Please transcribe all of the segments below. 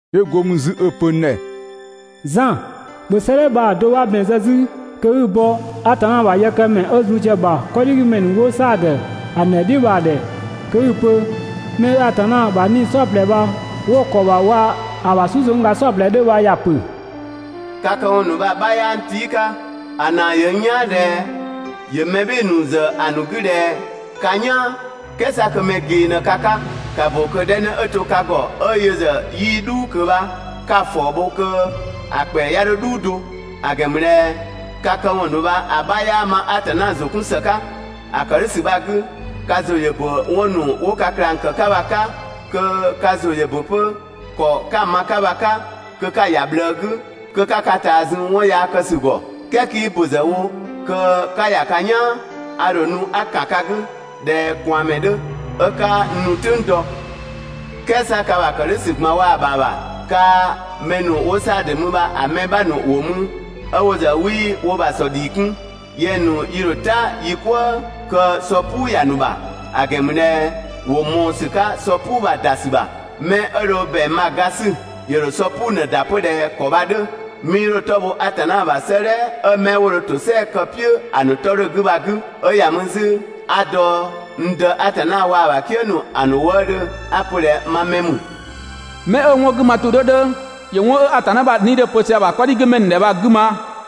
'Yö go mü 'zü 'ö‑ pö n ‑dhɛ: «Zan, ‑bhö 'sëëdhɛ bha‑ do 'bha ‑bɛn zë 'zü kö 'i‑ bɔ Atanna ‑bha yëkëmɛ 'ö zun sië‑ ‑bha 'kɔdhigümɛ ‑nu 'wo Saadö ‑a ‑nu ‑dhɛ "dhiʋ̈ bha‑ ‑dhɛ kö 'i‑ pö:: «'Mɛ 'ö Atanna ‑bha 'nii‑ "saɔplɛ bha 'wo‑ ‑kɔ ‑bha waa‑ ‑a ‑bha "susëngga "saɔplɛ 'dhö bha ‑ya ‑pö: Ka këwɔn ‑nu bha‑ 'bha 'yaa n tii' 'ka. ‑A ‑naa ‑yö n "yaan ꞊dhɛ ‑yö mɛ "bhɩɩ‑ ‑nu ‑zë ‑a ‑nu 'gü ꞊dhɛ ka "yaan, "kɛɛ 'sa kö mɛ ꞊gee ꞊në ka 'ka. ‑Ka ‑bö kö‑ 'dhɛ 'në 'ö to ka ‑gɔ 'ö yö ‑zë 'yii "dhuu ꞊kö bha 'ka‑ ‑fɔɔ bho kö‑ ‑kpɛa 'ya 'dho "dhuu do. ‑A ‑gɛn ‑mü ꞊dhɛ ka këwɔn ‑nu bha‑ 'bha 'yaa ma Atanna ‑zʋ 'kun ‑së 'ka. ‑A ‑kë "dhʋ̈ ‑sü bha‑ 'gü, ka ‑zʋ ‑yö ‑bö 'wɔn ‑nu 'wo ka ꞊klang ‑kë 'ka bha‑ 'ka kö ka ‑zʋ ‑yö ‑bö 'pö ‑kɔ 'ka‑ ma‑ 'ka bha‑ 'ka, kö 'ka‑ ‑ya ꞊bhlëë 'gü, kö 'ka ka ꞊taa zun 'wɔn yaa kë ‑sü ‑gɔ. "Kɛɛ 'kii ‑bö ‑zë wo kö 'ka ‑ya ka "yaan, a ‑dho nu 'a ‑kan ka 'gü ꞊dhɛ ꞊kwaanmɛ 'dhö, 'ö 'kaa n ‑nu "tʋ̈ng dɔ. "Kɛɛ 'sa ka ‑bha ‑kë "dhʋ̈ ‑sü ꞊gban waa‑ ‑bha ‑bha, kaa‑ mɛ ‑nu 'wo Saadö mü bha‑ mɛ 'bha ‑nu ‑wo mü 'ö wo ‑zë 'wii wo ‑bha ‑sɔ ‑dhii 'kun. Yɛng‑ ‑nu yi ‑dho "ta yi "kwëë kö sɔ "puu ‑ya ‑nu ‑bha, ‑a ‑gɛn ‑mü ꞊dhɛ ‑wo ꞊mɔɔ ‑sü 'ka sɔ "puu bha‑ ‑da ‑sü ‑bha. Mɛ 'ö dho ‑bɛang bha‑ ga 'sü, ‑yö ‑dho sɔ "puu ꞊në‑ ‑da 'pö ꞊dhɛ ‑kɔ bha‑ 'dhö, 'mii 'dho‑ 'tɔ bho Atanna ‑bha 'sëëdhɛ 'ö 'mɛ 'wo dho ‑tosɛa kë‑ "piʋ̈ ‑a ‑nu 'tɔ 'dhö‑ 'gü bha‑ 'gü. 'Ö ‑ya mü 'zü 'a dɔ n Dë Atanna waa‑ ‑bha "kië ‑nu ‑a ‑nu wëëdhö 'a‑ pö ꞊dhɛ ma mɛ ‑mü. 'Mɛ 'ö‑ 'wɔn 'gü ma ‑tʋ 'dhö 'dhö ‑yö 'wɔn 'ö Atanna ‑bha 'Nii‑ 'dhö‑ pö sië ‑a ‑bha 'kɔdhigümɛ ‑nu ‑dhɛ bha‑ 'gü ma.»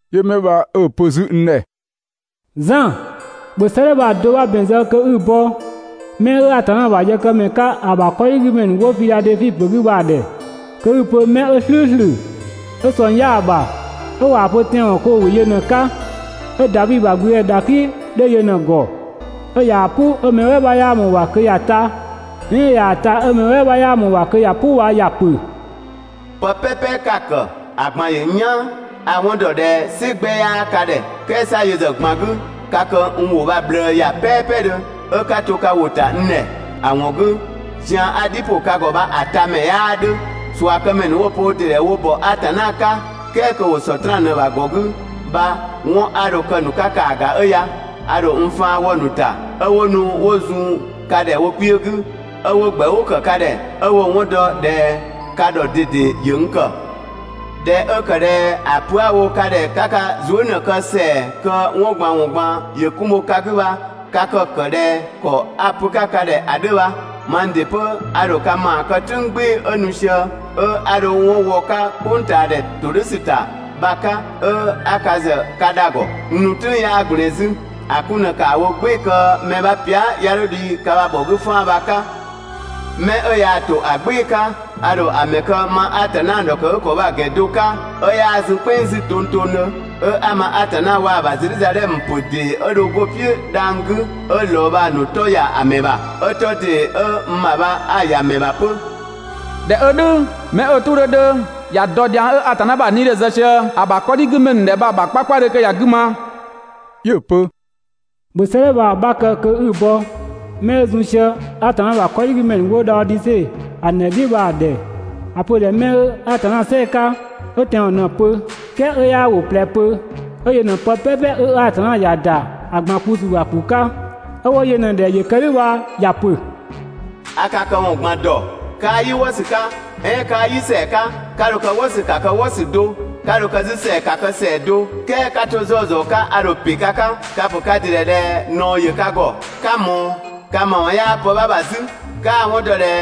'Yö 'mɛ bha 'ö‑ pö 'zü n ‑dhɛ 'ö‑ pö: «Zan, ‑bhö 'sëëdhɛ bha‑ do 'bha ‑bɛn zë kö 'i‑ bɔ 'mɛ 'ö Atanna ‑bha yëkëmɛ 'ka ‑a ‑bha 'kɔdhigümɛ ‑nu 'wo Fidhadɛfi ‑pö 'gü bha‑ ‑dhɛ kö 'i‑ pö: 'Mɛ 'ö "slʋ̈ʋ̈slʋ̈, 'ö ꞊sɔng 'yaa‑ ‑bha, 'ö ꞊waa‑ pö tɛanwɔn, kö ‑wo ‑wɩ yö ꞊në‑ 'ka, 'ö Davi ‑bha ‑gblüdëdhɛ ‑dhaklɩ 'dhö yö ꞊në‑ ‑gɔ, 'ö ꞊yaa‑ "pʋ 'ö mɛ "wɛɛ 'bha 'yaa ꞊mɔɔ‑ ‑bha kö ‑ya ta, "ɛɛn 'ö ꞊yaa‑ ta, 'ö mɛ "wɛɛ 'bha 'yaa ꞊mɔɔ‑ ‑bha kö ‑ya "pʋ bha ‑ya pö: «Pë "pɛpɛ 'ka‑ ‑kë, ‑a ꞊gban ‑yö n "yaan. A‑ 'wɔn ‑dɔ ꞊dhɛ "sɩ 'gbɛ 'yaa ka ‑dhɛ. "Kɛɛ 'sa yö ‑zë ꞊gban 'gü ka kë n ‑wʋ bha‑ ꞊bhlëë ‑ya "pɛpɛdhö 'ö 'ka to ka ‑wʋ ‑ta n ‑dhɛ. ‑A ‑wɔn 'gü, zian 'a‑ "dhi ‑pʋ ka ‑gɔ bha‑ tamɛ 'yaa 'dhö. ꞊Suakëmɛ ‑nu 'wo‑ pö wo ‑dɩ ‑dhɛ wo ‑bɔ Atanna 'ka, "kɛɛ kö ‑wo Sɔtraan ꞊në‑ ‑bha ‑gɔ 'gü bha 'wɔn 'a dho‑ kë‑ ‑nu 'ka ‑kaa ‑ga 'ö ya: A ‑dho n faan wɔ‑ ‑nu ‑ta 'ö 'wo nu 'wo zun ka ‑dhɛ wo kpiö 'gü, 'ö 'wo ‑gbɛʋʋ ‑kë ka ‑dhɛ, 'ö 'wo‑ 'wɔn dɔ ꞊dhɛ ka ‑dhɔ ꞊dede ‑yö n ‑kë. ꞊Dhɛ 'ö ‑kë ꞊dhɛ ‑a pö 'a‑ wo ka ‑dhɛ 'ka ka zuë" ꞊në‑ kë ‑sɛa kö 'wɔn ꞊gban ‑wɔn ꞊gban ‑yö 'kun bho ka 'gü bha, ka kë‑ ‑kë ꞊dhɛ ‑kɔ 'a‑ pö‑ 'ka ka ‑dhɛ ‑a 'dhö bha, mang ‑dɩ 'pö a ‑dho ka ‑maa kë "tʋ̈ng "gbɩɩ‑ 'ö nu sië, 'ö 'a dho 'wɔn wɔ‑ 'ka "kpʋngtaadhɛ ‑todhʋ̈sü ‑ta bha‑ 'ka 'ö 'a ka ‑zë ka dha‑ ‑gɔ. N nu "tʋ̈ng 'yaa ꞊gblɛɛn 'zü. ‑A 'kun ꞊në ‑kaa wo "gbɩɩ‑ kö mɛ 'bha pia" 'ya 'dho dhi ka ‑bha ‑bhɔ 'gü 'faan‑ bha‑ 'ka. 'Mɛ 'ö yaa‑ ‑to ‑a "gbɩɩ‑ 'ka, a ‑dho ‑a ‑mɛ kë ma Atanna ‑dhɔkëgükɔ bha‑ ‑gɛn do 'ka, 'ö 'yaa zun "kpɛnng 'zü tongtongdhö, 'ö 'a ma Atanna waa‑ ‑bha Zedhizadhɛmö ‑pö ‑dee 'ö dho 'go‑ "piʋ̈ dhang‑ 'gü 'ö ‑lɔɔ bha‑ ‑nu 'tɔ ‑ya ‑a ‑mɛ ‑bha. 'Ö 'tɔ ‑dee 'ö n ‑bha bha 'a‑ ‑ya ‑mɛ ‑bha 'pö. ꞊Dhɛ 'ö "dhʋ̈, 'mɛ 'ö‑ "tʋ 'dhö 'dhö, ‑ya dɔ dhiang 'ö Atanna ‑bha 'Nii‑ 'dhö‑ zë sië ‑a ‑bha 'kɔdhigümɛ ‑nu ‑dhɛ bha‑ ‑bha 'kpakpadhö kö ‑ya 'gü ma!» 'Yö‑ pö: «‑Bhö 'sëëdhɛ bha‑ 'bha kë kö 'i‑ bɔ 'mɛ 'ö zun sië Atanna ‑bha 'kɔdhigümɛ ‑nu 'wo Dhaodise ‑a ‑nu ‑dhɛ "dhiʋ̈ bha‑ ‑dhɛ. ‑A pö‑ ‑dhɛ 'mɛ 'ö Atanna "sɛɛ‑ 'ka, 'ö tɛanwɔn ꞊në‑ pö, "kɛɛ 'ö 'yaa ‑wʋ ꞊plɛ pö, 'ö yö ꞊në pë "pɛpɛ 'ö Atanna ‑ya ‑da ‑a ꞊gban kpu ‑sü ‑bha ‑kpu 'ka, 'ö 'wo yö ꞊në ‑dhɛ ‑yö kë "dhʋ̈ bha ‑ya ‑pö: A ka këwɔn ꞊gban dɔ. 'Kaa "yi "wɔsü 'ka, "ɛɛn 'kaa "yi ‑sɛa 'ka. 'Ka dho kë "wɔsü ‑ka kë "wɔsü do, 'ka dho kë 'zü ‑sɛa ‑ka kë ‑sɛa do, "kɛɛ 'ka 'to 'zɔzɔ 'ka a ‑dho ‑pe ka 'ka. Ka‑ ‑pö ka ‑dɩ ‑dhɛ ꞊dhɛ ꞊naɔ ‑yö ka ‑gɔ, 'ka ꞊mɔɔ, ka ‑ma ‑wɔn 'yaa pë 'bha ‑bha 'zü, 'kaa‑ 'wɔn dɔ ꞊dhɛ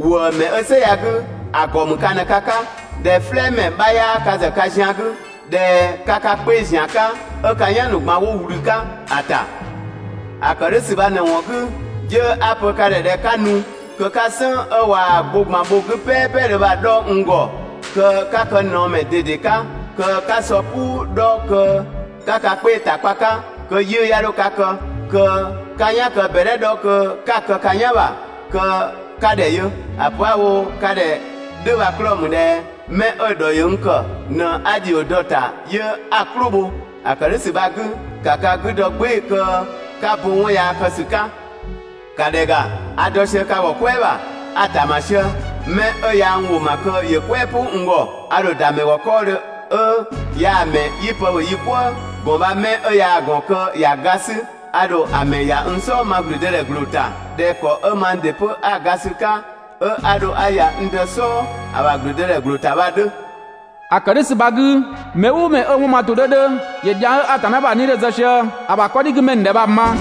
‑wëëmɛ 'ö "sɛ ya‑ 'gü ‑a ‑gɔ ‑mü ka ꞊në ka 'ka, ꞊dhɛ "flɛɛmɛ 'bha 'yaa ka ‑zë ka zian‑ 'gü, ꞊dhɛ ka ka 'kpee‑ ‑zian 'ka 'ö ka "yan ‑nu ꞊gban 'wo ꞊wlü 'ka‑ ‑ta. ‑A ‑kë "dhʋ̈ ‑sü bha ꞊në‑ ‑wɔn 'gü, 'yö 'a‑ pö ka ‑dhɛ ꞊dhɛ 'ka nu, kö 'ka "sënng 'ö ꞊waa‑ gbo ꞊gban bho‑ 'gü "pɛpɛdhö bha‑ 'dhɔ n ‑gɔ, kö 'ka kë ꞊naɔmɛ ꞊dede 'ka, kö 'ka sɔ "puu 'dhɔ kö 'ka ka 'kpee‑ ‑ta kpa‑ 'ka kö 'yiʋ̈‑ 'ya 'dho ka kë, kö 'ka "yan kë ꞊bɛdhɛ 'dhɔ kö 'ka‑ kë ka "yan ‑bha kö 'ka ‑dhɛ yö. ‑A pö 'a‑ wo ka ‑dhɛ "dhʋ̈ bha‑ 'klɔɔ‑ ‑mü ꞊dhɛ 'mɛ 'ö‑ ‑dhɔ ‑yö n ‑kë ꞊në 'a ‑dhio dɔ‑ ‑ta 'yö 'a‑ "klʋ bho. ‑A ‑kë "dhʋ̈ ‑sü bha‑ 'gü, ‑ka ka 'gü dɔ "gbɩɩ‑ kö 'ka bo 'wɔn yaa kë ‑sü 'ka. ‑Ka ‑dhɛ ‑ga, a dɔ sië ka ‑gɔ "kwɛɛ ‑bha, a‑ ‑tama sië. 'Mɛ 'ö ꞊ya n ‑wʋ ma kö ‑yö "kwɛɛ "pʋ n ‑gɔ, a ‑dho ‑da ‑mɛ ‑gɔ 'kɔɔdhö 'ö yaa‑ ‑mɛ 'yi pë ‑bhö yi "kwëë. ‑Gɔn bha 'mɛ 'ö yaa‑ ‑gɔn kö ‑ya ga 'sü, a ‑dho ‑a ‑mɛ ‑ya n "sɔɔ ma ‑blüdëdhɛ ‑gbloo ‑ta, ꞊dhɛ ‑kɔ 'ö mang ‑dɩ 'pö 'a‑ ga sü‑ 'ka, 'ö 'a dho 'a ‑ya n Dë "sɔɔ, ‑a ‑bha ‑blüdëdhɛ ‑gbloo ‑ta bha‑ 'dhö. ‑A ‑kë "dhʋ̈ ‑sü bha‑ 'gü, mɛ "ʋʋ mɛ 'ö‑ 'wɔn ma ‑tʋ 'dhö 'dhö, ‑yö dhiang 'ö Atanna ‑bha 'Nii‑ 'dhö‑ zë sië ‑a ‑bha 'kɔdhigümɛ ‑nu ‑dhɛ bha‑ ma.